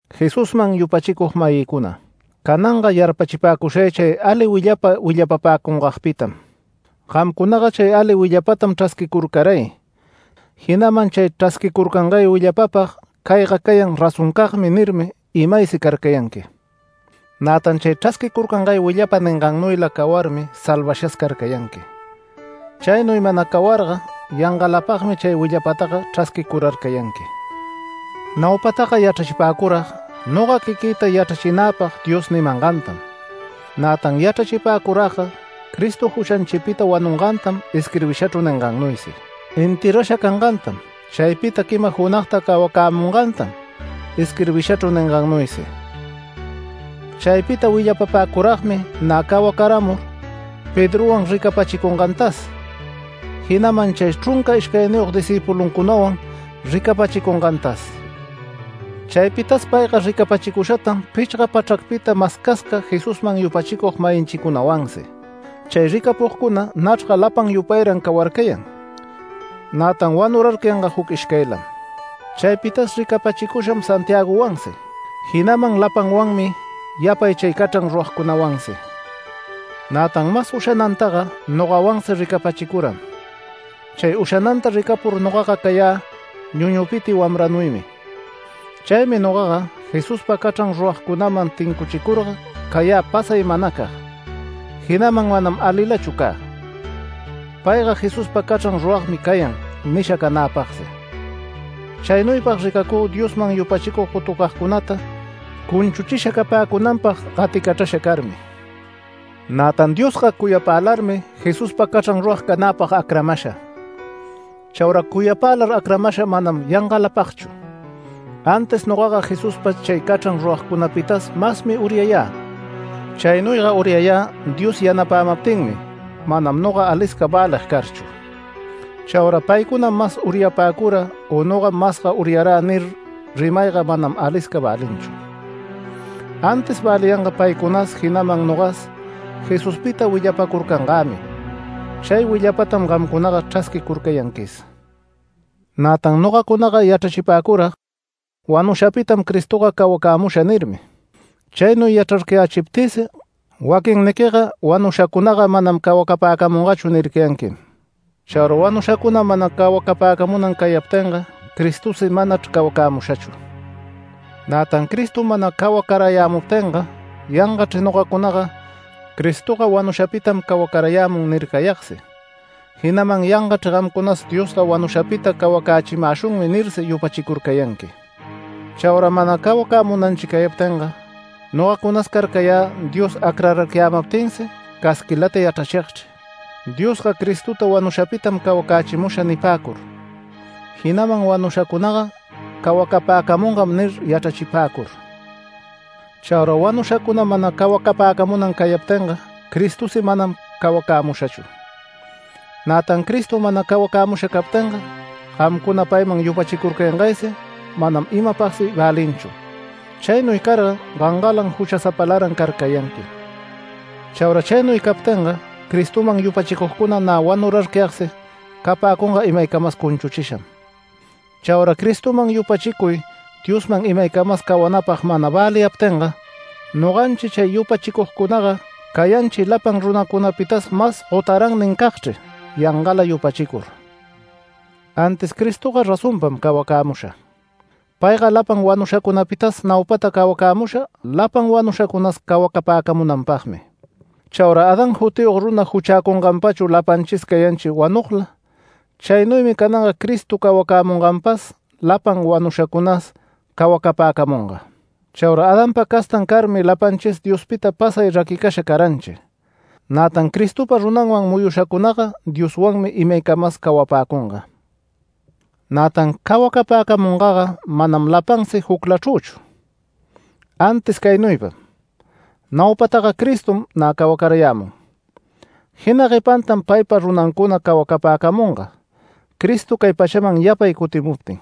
Jesusman yupachicug-mayïcuna, cananga yarpachipäcushay chay ali willapa willapapäcungagpitam. Gamcunaga chay ali willapatam chrasquicurcaray, jinaman chay chrasquicurcangay willapapag “Cayga cayan razoncagmi” nirmi imaysi carcayanqui. Nätan chay chrasquicurcangay willapa ningannuyla cawarmi salvashas carcayanqui. Chaynuy mana cawarga yangalapagmi chay willapataga chrasquicurarcayanqui. Naupataga yachrachipäcurag noga quiquïta yachrachinäpag Dios nimangantam, nätan yachrachipäcuragga Cristo juchanchipita wanungantam isquirbishachru ningannuysi, enterrasha cangantam, chaypita quima junagta cawacämungantam isquirbishachru ningannuysi. Chaypita willapapäcuragmi nä cawacaramur Pedrowan ricapachicungantas, jinaman chay chrunca ishcayniyog discïpuluncunawan ricapachicungantas. Chaypitas payga ricapachicushatan pichga pachracpita mascasca Jesusman yupachicug-mayinchicunawansi. Chay ricapugcuna nachrga lapan yupayran cawarcayan, nätan wanurarcayanga juc ishcaylam. Chaypitas ricapachicusham Santiagowansi, jinaman lapanwanmi yapay chay cachran ruragcunawansi. Nätan mas ushanantaga nogawansi ricapachicuram. Chay ushananta ricapur nogaga cayä ñuñupiti wamranuymi. Chaymi nogaga Jesuspa cachran ruragcunaman tincuchicurga cayä pasay manacag, jinaman manam alilachu cä “Payga Jesuspa cachran ruragmi cayan” nisha canäpagsi. Chaynuypag ricacü Diosman yupachicug gotucagcunata cunchuchisha capäcunanpag gaticachrasha carmi. Nätan Diosga cuyapälarmi Jesuspa cachran rurag canäpag acramasha. Chaura cuyapälar acramasha manam yangalapagchu, antis nogaga Jesuspa chay cachran ruragcunapitas masmi uryayä. Chaynuyga uryayä Dios yanapämaptinmi manam noga alisca välig carchu. Chaura “Paycunam mas uryapäcura, u nogam masga uryarä” nir, rimayga manam alisca välinchu. Antis väliyanga paycunas, jinaman nogas Jesuspita willapacurcangämi. Chay willapatam gamcunaga chrasquicurcayanquis. Nätan nogacunaga yachrachipäcurag: “Wanushapitam Cristoga cawacämusha” nirmi. Chaynuy yachrarcayächiptïsi waquinniquiga “Wanushacunaga manam cawacapäcamungachu” nircayanquim. Chaura wanushacuna mana cawacapäcamunan cayaptinga, Cristosi manachr cawacämushachu. Nätan Cristo mana cawacarayämuptinga yangachr nogacunaga “Cristoga wanushapitam cawacarayämun” nircayagsi, jinaman “Yangachr gamcunas Diosga wanushapita cawacächimäshunmi” nirsi yupachicurcayanqui. Chaura mana cawacämunanchi cayaptinga, nogacunas carcayä Dios acrararcayämaptinsi casquilata yachrachigchri “Diosga Cristota wanushapitam cawacächimusha” nipäcur, jinaman “Wanushacunaga cawacapäcamungam” nir yachrachipäcur. Chaura wanushacuna mana cawacapäcamunan cayaptinga Cristosi manam cawacämushachu. Nätan Cristo mana cawacämusha captinga, gamcuna payman yupachicurcayangaysi manam imapagsi välinchu. Chaynuy carga gangalan juchasapalaran carcayanqui. Chaura chaynuy captinga Cristoman yupachicugcuna nä wanurarcayagsi capäcunga imaycamas cunchuchisham. Chaura Cristoman yupachicuy Dioswan imaycamas cawanäpag mana väliyaptinga, noganchi chay yupachicugcunaga cayanchi lapan runacunapitas mas gotarannincagchri yangala yupachicur. Antis Cristoga razonpam cawacämusha. Payga lapan wanushacunapitas naupata cawacämusha, lapan wanushacunas cawacapäcamunanpagmi. Chaura Adán jutiyog runa juchäcunganpachu lapanchis cayanchi wanugla, chaynuymi cananga Cristo cawacämunganpas lapan wanushacunas cawacapäcamunga. Chaura Adanpa castan carmi lapanchis Diospita pasay raquicasha caranchi. Nätan Cristopa runanman muyushacunaga Dioswanmi imaycamas cawapäcunga. Nätan cawacapäcamungaga manam lapansi juclachrüchu, antis caynuypam; naupataga Cristom nä cawacarayämun, jina guepantam paypa runancuna cawacapäcamunga Cristo cay pachaman yapay cutimuptin.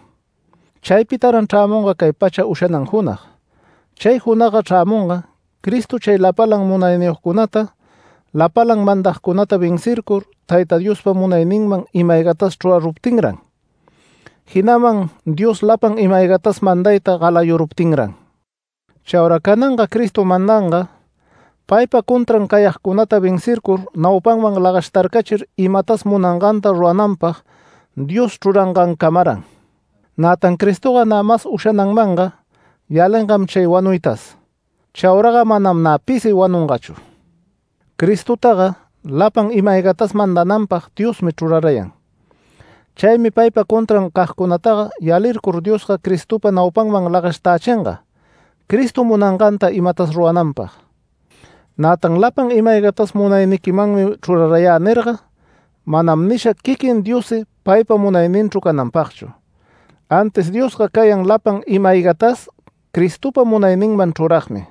Chaypitaran chrämunga cay pacha ushanan junag. Chay junagga chrämunga, Cristo chay lapalan munayniyogcunata, lapalan mandagcunata vencircur Tayta Diospa munayninman ima-aygatas chruraruptinran, jinaman Dios lapan ima-aygatas mandayta galayuruptinran. Chaura cananga Cristo mandanga, paypa contran cayagcunata vencircur naupaman lagashtarcachir imatas munanganta rurananpag, Dios chrurangancamaran. Nätan Cristoga nä mas ushananmanga yalingam chay wanuytas. Chauraga manam nä pisi wanungachu. Cristotaga lapan ima-aygatas mandananpag Diosmi chrurarayan. Chaymi paypa contran cagcunataga yalicur Diosga Cristopa naupanman lagashtächinga Cristo munanganta imatas rurananpag. Nätan “Lapan ima-aygatas munayniquimanmi chrurayä” nirga manam nisha quiquin Diossi paypa munayninchru cananpagchu. Antis Diosga cayan lapan ima-aygatas Cristopa munayninman chruragmi.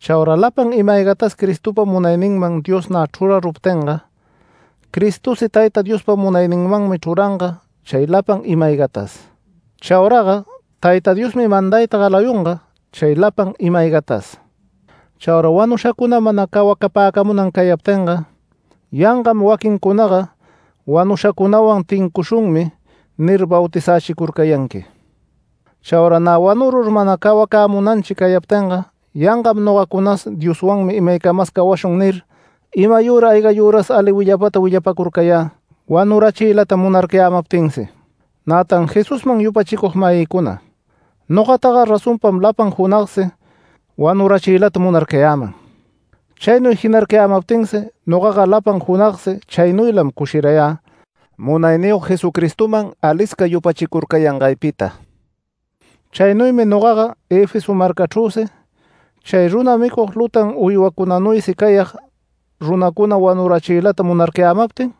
Chaura lapan ima-aygatas Cristopa munayninman Dios nä chruraruptinga, Cristosi Tayta Diospa munayninmanmi chruranga chay lapan ima-aygatas. Chauraga Tayta Diosmi mandayta galayunga chay lapan ima-aygatas. Chaura wanushacuna mana cawacapäcamunan cayaptinga, yangam waquincunaga “Wanushacunawan tincushunmi” nir bautizächicurcayanqui. Chaura nä wanurur mana cawacämunanchi cayaptinga yangam nogacunas “Dioswanmi imaycamas cawashun” nir, imayüra aygayüras ali willapata willapacurcayä, wanurachiylata munarcayämaptinsi. Nätan Jesusman yupachicug-mayïcuna nogataga razonpam lapan junagsi wanurachiylata munarcayäman. Chaynuy jinarcayämaptinsi nogaga lapan junagsi chaynuylam cushirayä Munayniyog Jesucristoman alisca yupachicurcayangaypita. Chaynuymi nogaga Efeso marcachrüsi, chay runa micug lutan uywacunanuysi cayag runacuna wanurachiylata munarcayämaptin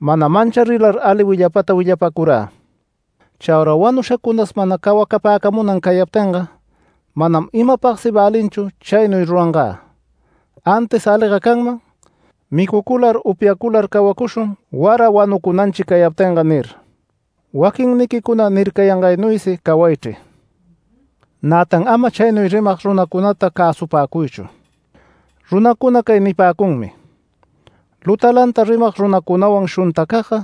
mana mancharilar ali willapata willapacurä. Chaura wanushacunas mana cawacapäcamunan cayaptinga manam imapagsi välinchu chaynuy rurangä, antis aliga canman: “Micucular upyacular cawacushun, wara wanucunanchi cayaptinga” nir, waquinniquicuna nircayangaynuysi cawaychri. Nätan ama chaynuy rimag runacunata cäsupapäcuychu. Runacuna cay nipäcunmi: “Lutanlata rimag runacunawan shuntacagga,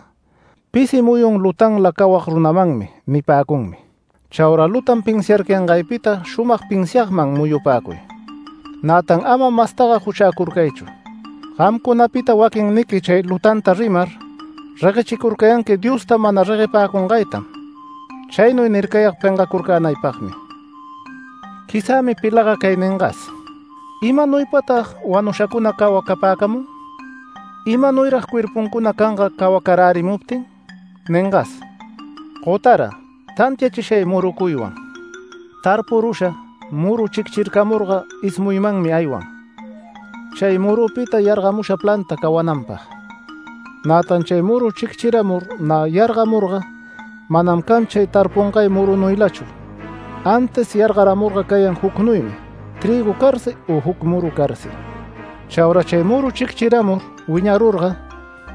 pisi muyun lutanla cawag runamanmi” nipäcunmi. Chaura lutan pinsiarcayangaypita shumag pinsiagman muyupäcuy. Nätan ama mastaga juchäcurcaychu. Gamcunapita waquinniqui chay lutanta rimar reguechicurcayanqui Diosta mana reguepäcungaytam. Chaynuy nircayag pengacurcänaypagmi. Quizämi pilaga cay ningas: “¿Imanuypata wanushacuna cawacapäcamun? ¿Imanuyrag cuerpuncuna canga cawacarärimuptin?” ningas. ¡Gotara! Tantiachishay murucuywan. Tarpurusha muru chicchircamurga ismuymanmi aywan, chay murupita yargamusha planta cawananpag. Nätan chay muru chicchiramur nä yargamurga manam can chay tarpungay murunuylachu, antis yargaramurga cayan jucnuymi, trïgu carsi u juc muru carsi. Chaura chay muru chicchiramur wiñarurga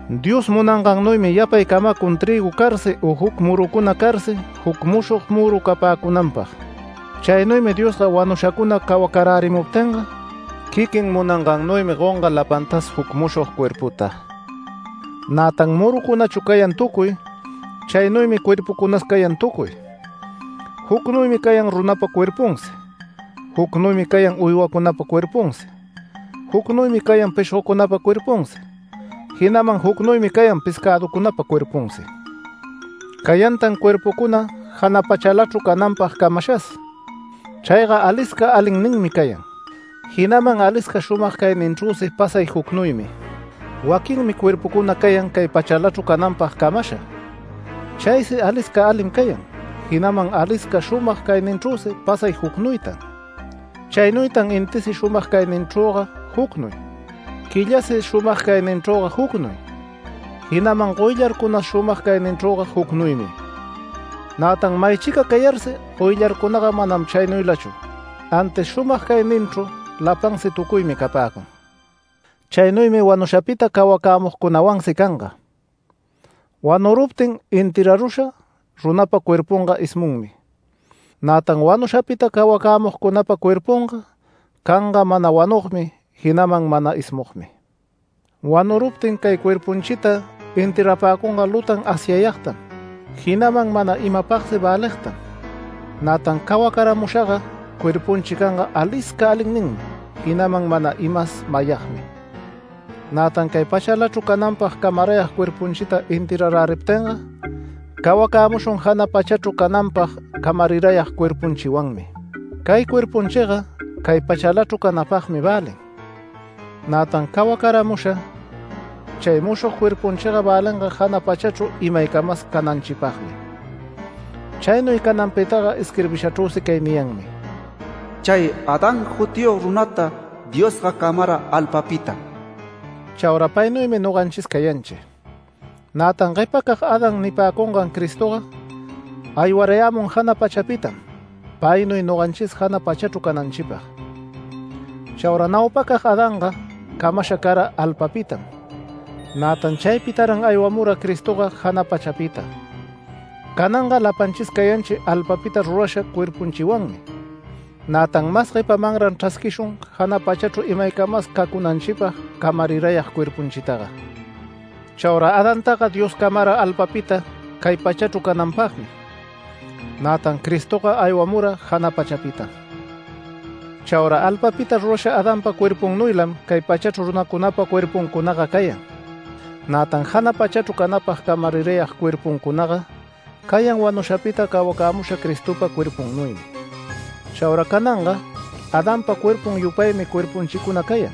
Dios munangannuymi yapay camacun trïgu carsi u juc murucuna carsi juc mushog muru capäcunanpag. Chaynuymi Diosga wanushacuna cawacarärimuptinga quiquin munangannuymi gonga lapantas juc mushog cuerputa. Nätan murucunachu cayan tucuy, chaynuymi cuerpucunas cayan tucuy. Jucnuymi cayan runapa cuerpunsi, jucnuymi cayan uywacunapa cuerpunsi, jucnuymi cayan pishgocunapa cuerpunsi, jinaman jucnuymi cayan pescäducunapa cuerpunsi. Cayantan cuerpucuna jana pachalachru cananpag camashas. Chayga alisca alinninmi cayan, jinaman alisca shumag cayninchrüsi pasay jucnuymi. Waquinmi cuerpucuna cayan cay pachalachru cananpag camasha. Chaysi alisca alim cayan, jinaman alisca shumag cayninchrüsi pasay jucnuytan. Chaynuytan intisi shumag cayninchrüga jucnuy, quillasi shumag cayninchrüga jucnuy, jinaman goyllarcunas shumag cayninchrüga jucnuymi. Nätan maychica cayarsi goyllarcunaga manam chaynuylachu, antis shumag cayninchru lapansi tucuymi capäcun. Chaynuymi wanushapita cawacämugcunawansi canga: Wanuruptin enterrarusha runapa cuerpunga ismunmi. Nätan wanushapita cawacämugcunapa cuerpunga canga mana wanugmi jinaman mana ismugmi. Wanuruptin cay cuerpunchita enterrapäcunga lutan asyayagtam. Jinaman mana imapagsi väligtam, nätan cawacaramushaga cuerpunchi canga alisca alinninmi, jinaman mana imas mayagmi. Nätan cay pachalachru cananpag camarayag cuerpunchita enterraräriptinga, cawacämushun jana pachachru cananpag camarirayag cuerpunchiwanmi. Cay cuerpunchiga cay pachalachru canapagmi välin, nätan cawacaramusha chay mushog cuerpunchiga välinga jana pachachru imaycamas cananchipagmi. Chaynuy cananpitaga isquirbishachrüsi cay niyanmi: “Chay Adán jutiyog runata Diosga camara alpapitam”. Chaura paynuymi noganchis cayanchi. Nätan guepacag Adán nipäcungan Cristoga aywarayämun jana pachapitam paynuy noganchis jana pachachru cananchipag. Chaura naupacag Adanga camasha cara alpapitam. Nätan chaypitaran aywamura Cristoga jana pachapita. Cananga lapanchis cayanchi alpapita rurasha cuerpunchiwanmi. Nätan mas guepamanran chrasquishun jana pachachru imaycamas cacunanchipag camarirayag cuerpunchitaga. Chaura Adantaga Dios camara alpapita cay pachachru cananpagmi, nätan Cristoga aywamura jana pachapitam. Chaura alpapita rurasha Adanpa cuerpunnuylam cay pachachru runacunapa cuerpuncunaga cayan. Nätan jana pachachru canapag camarirayag cuerpuncunaga cayan wanushapita cawacämusha Cristopa cuerpunnuymi. Chaura cananga Adanpa cuerpun yupaymi cuerpunchicuna cayan.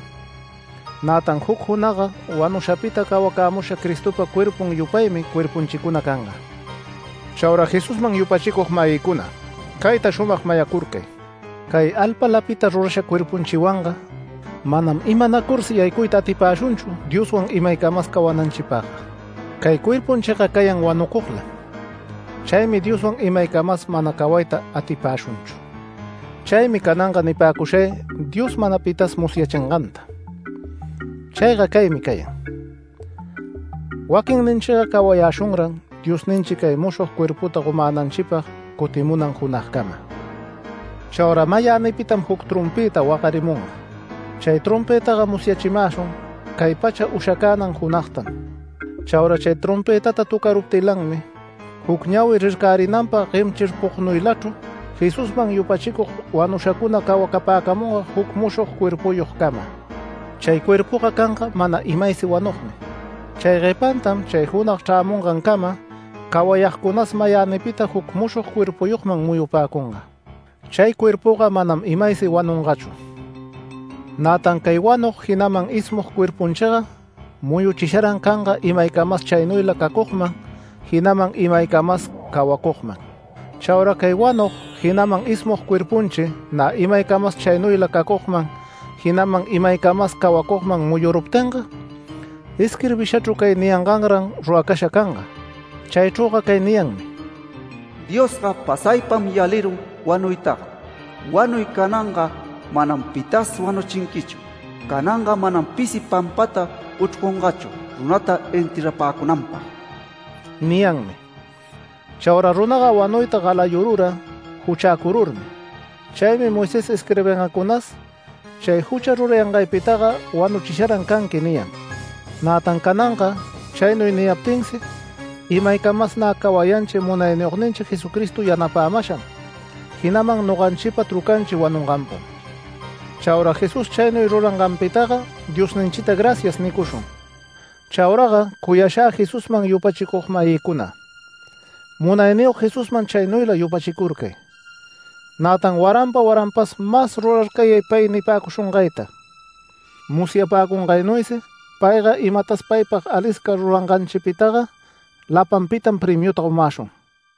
Nätan juc junagga wanushapita cawacämusha Cristopa cuerpun yupaymi cuerpunchicuna canga. Chaura Jesusman yupachicug-mayïcuna, cayta shumag mayacurcay: Cay alpalapita rurasha cuerpunchiwanga manam imanacursi yaycuyta atipäshunchu Dioswan imaycamas cawananchipagga. Cay cuerpunchiga cayan wanucuglam. Chaymi Dioswan imaycamas manam cawayta atipäshunchu. Chaymi cananga nipäcushay Dios mana pitas musyachinganta. Chayga caymi cayan: Waquinninchiga cawayäshunran Diosninchi chay mushog cuerputa gomänanchipag cutimunan junagcama. Chaura mayänipitam juc trompëta wagarimunga. Chay trompëtaga musyachimäshun cay pacha ushacänan junagtam. Chaura chay trompëtata töcaruptilanmi juc ñawi rircarinanpag guemchirpugnuylachru Jesusman yupachicug wanushacuna cawapäcamunga juc mushog cuerpuyogcama. Chay cuerpuga canga mana imaysi wanugmi. Chay guepantam chay junag chrämungancama cawayagcunas mayänipita juc mushog cuerpuyogman muyupäcunga. Chay cuerpuga manam imaysi wanungachu. Nätan cay wanug, jinaman ismug cuerpunchiga muyuchisharan canga imaycamas chaynuyla cacugman, jinaman imaycamas cawacugman. Chaura cay wanug jinaman ismug cuerpunchi nä imaycamas chaynuyla cacugman, jinaman imaycamas cawacugman muyuruptinga, isquirbishachru cay niyanganran ruracasha canga. Chaychrüga cay niyanmi: “Diosga pasaypam yalirun wanuytaga. Wanuy, cananga manam pitas wanuchinquichu. Cananga manam pisi pampata uchrcungachu runata enterrapäcunanpag” niyanmi. Chaura runaga wanuyta galayurura juchäcururmi. Chaymi Moisés isquirbingancunas “Chay jucha rurangaypitaga wanuchisharan canqui” niyan. Nätan cananga chaynuy niyaptinsi, imaycamas nä cawayanchi Munayniyogninchi Jesucristo yanapämasham, jinaman noganchipa trucanchi wanunganpam. Chaura Jesús chaynuy ruranganpitaga Diosninchita “Gracias” nicushun. Chauraga cuyashä Jesusman yupachicug-mayïcuna, Munayniyog Jesusman chaynuyla yupachicurcay. Nätan waranpa waranpas mas rurarcayay pay nipäcushungayta. Musyapäcungaynuysi payga imatas paypag alisca ruranganchipitaga lapanpitam premiuta gomäshun.